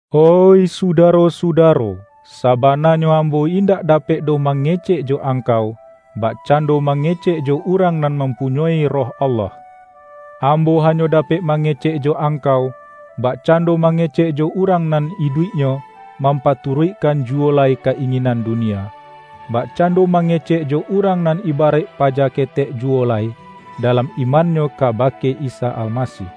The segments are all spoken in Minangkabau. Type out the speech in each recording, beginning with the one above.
Oih sudaro-sudaro, sabananyo ambo indak dapek doh mange-cek jo angkau, bakcando mangecek jo urang nan mampunyoi Roh Allah. Ambo hanyo dapek mangecek jo ang-kau, bakcando mangecek jo urang nan iduiknyo, mampaturuikkan juwo lai ka-inginan dunia; bakcando mange-cek jo urang nan ibaraik paja ketek juwo lai, dalam imannyo kabake Isa Almasih.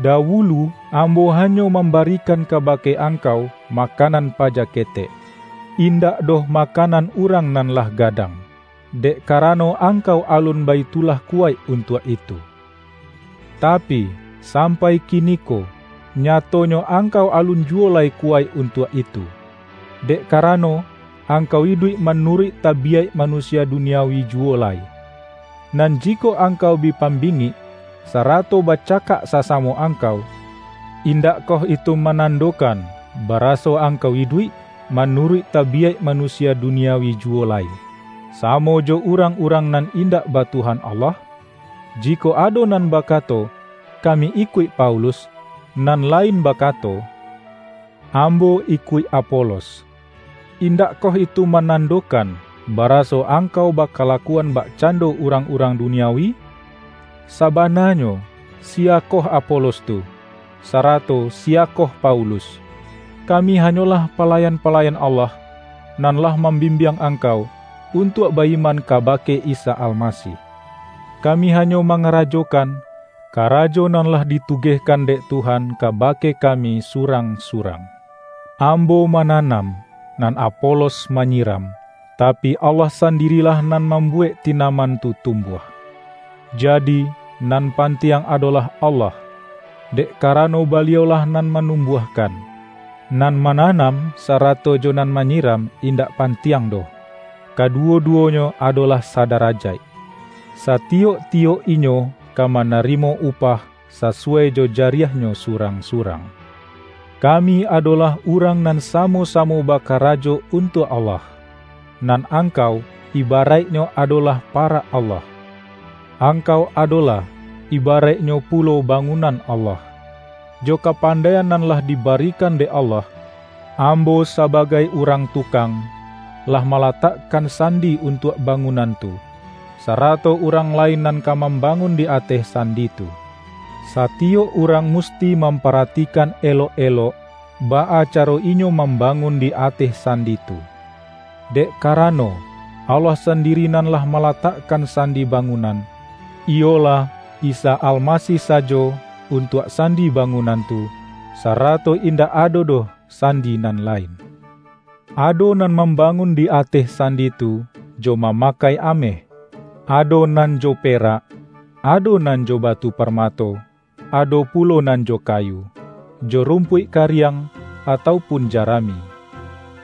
Dawulu ambo hanyo mam-barikan kabake angkau makanan paja ketek, indak doh makanan urang nan lah gadang; dek karano angkau alun baitulah kuwaik untuak itu. Tapi, sam-pai kiniko, nyatonyo angkau alun ju-wo lai kuwaik untuak itu, dek kara-no, angkau iduik manuruik tabiyaik manusia duniawi juwo lai. Nan jikok angkau bi pambingik, sarato bacakak sasamo angkau, indakkoh itu manan-dokan, baraso angkau iduik manuruik tabiyaik manusia duniawi juwo lai, sa-mo jo urang-urang nan indak ba Tuhan Allah? Jikok ado nan bakato,”Kami ikuik Paulus,” nan lain bakato,”Ambo ikuik Apolos,” indakkoh itu manando-kan, baraso angkau bakalakuan bak-cando urang-urang duniawi? Sabananyo siyakoh Apolos tu? Sa-rato siyakoh Paulus? Kami hanyolah palayan-palayan Allah, nan lah mam-bimbiang angkau, untuak ba-iman ka-bake Isa Almasih. Kami hanyo mangarajokan, karajo nan lah ditugehkan dek Tuhan kabake kami surang-su-rang. Ambo mananam, nan Apolos manyiram, tapi, Allah sandirilah nan mambuwek tinaman tu tumbuah. Ja-di, nan pantiang adolah Allah, dek ka-rano Baliau-lah nan manumbuahkan. Nan mananam, sarato jo nan manyi-ram, indak pantiang doh; kaduwo-duwonyo adolah sadarajaik. Satiyok-ti-yok inyo ka manarimo upah, sasuwai jo jariahnyo surang-surang. Kami adolah urang nan samo-samo baka-rajo untuak Allah; nan angkau, iba-raiknyo adolah parak Allah. Angkau adolah, ibaraiknyo pulo ba-ngunan Allah. Jo kapandaian nan lah dibarikan dek Allah, ambo sabagai urang tukang, lah malatakkan sandi un-tuak bangunan tu, sarato urang lain nan ka mambangun di ateh sandi tu. Satiyok urang musti mamparatikan elok-elok, baa caro inyo mambangun di ateh san-di tu. Dek karano, Allah sandiri nan lah malatakkan sandi bangunan, iyo-lah, Isa Almasih sajo, untuak sandi ba-ngunan tu, sarato indak ado doh san-di nan lain. Ado nan mambangun di ateh sandi tu, jo mamakai ameh, ado nan jo perak, ado nan jo batu parmato, ado pulo nan jo kayu, jo rumpuik ka-riang, atau pun jarami.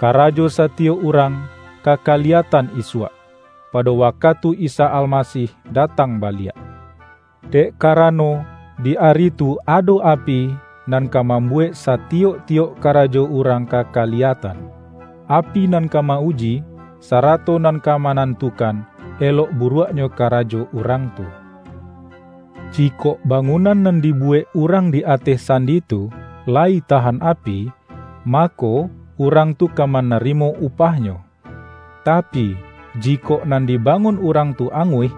Karajo satiyok urang, ka kaliyatan isuak, pado wakatu Isa Almasih datang baliak. Dek karano, di ari tu ado api, nan ka mambuwek sa-tiyok-tiyok karajo urang ka kaliyatan. Api nan ka ma-uji, sarato nan ka manan-tukan, elok buruaknyo karajo urang tu. Jikok bangunan nan dibuwek urang di ateh sandi tu, layi tahan api, mako, urang tu ka manarimo upahnyo. Ta-pi, jikok nan dibangun urang tu anguih,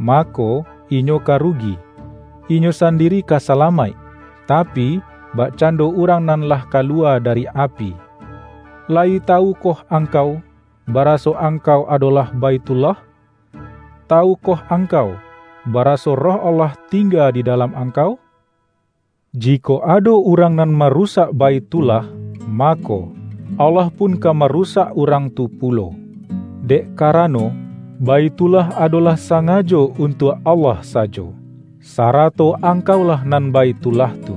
mako, inyo ka rugi; inyo sandiri ka sa-lamaik, tapi, bakcando urang nan lah kaluwa dari api. Layi tawukoh angkau, baraso ang-kau adolah Baithullah? Tawukoh angkau, baraso Roh Allah tingga di da-lam angkau? Jikok ado urang nan marusak Baithullah, mako, Allah pun ka marusak urang tu pulo. Dek ka-rano, Baithullah adolah sangajo un-tuak Allah sajo, sarato angkaulah nan Baithullah tu.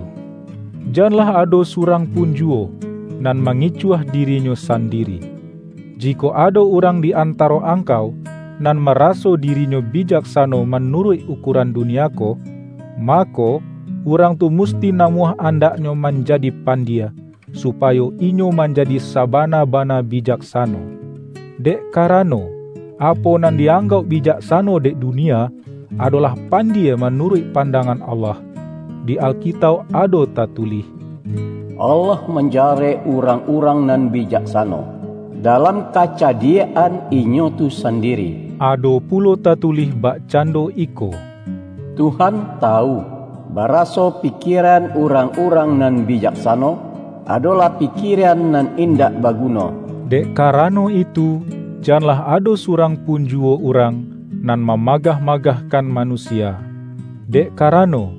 Janlah ado surang pun juwo, nan mangicuah dirinyo sandiri. Jikok ado urang di antaro angkau, nan maraso di-rinyo bijaksano manuruik ukuaran du-nia ko, mako, urang tu musti namuah andaknyo manjadi pandie, supayo inyo manjadi sabana-bana bijaksano. Dek karano, apo nan di-anggauk bijaksano dek dunia, adolah pandie manuruik pandangan Allah. Di Alkitauk ado tatu-lih,”Allah manjarek urang-urang nan bijaksano, dalam kacadiak-an inyo tu sandiri.” Ado pulo tatulih bakcan-do iko,”Tuhan tawu, baraso pikieran urang-urang nan bijaksano, adolah pi-kieran nan indak baguno.” Dek ka-rano itu, janlah ado surang pun juwo urang, nan mamagah-magahkan manu-sia, dek karano,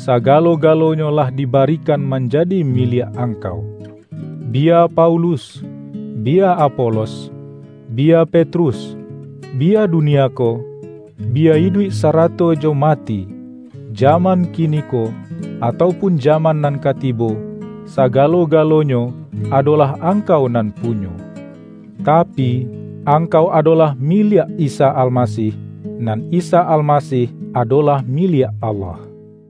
sagalo-galonyo lah di-barikan manjadi miliak angkau: biya Paulus, biya Apolos, biya Petrus, bi-ya dunia ko, biya iduik sarato jo ma-ti, jaman kiniko atau pun jaman nan ka tibo, sagalo-galonyo adolah ang-kau nan punyo. Tapi, angkau adolah miliak Isa Almasih, nan Isa Almasih adolah miliak Allah.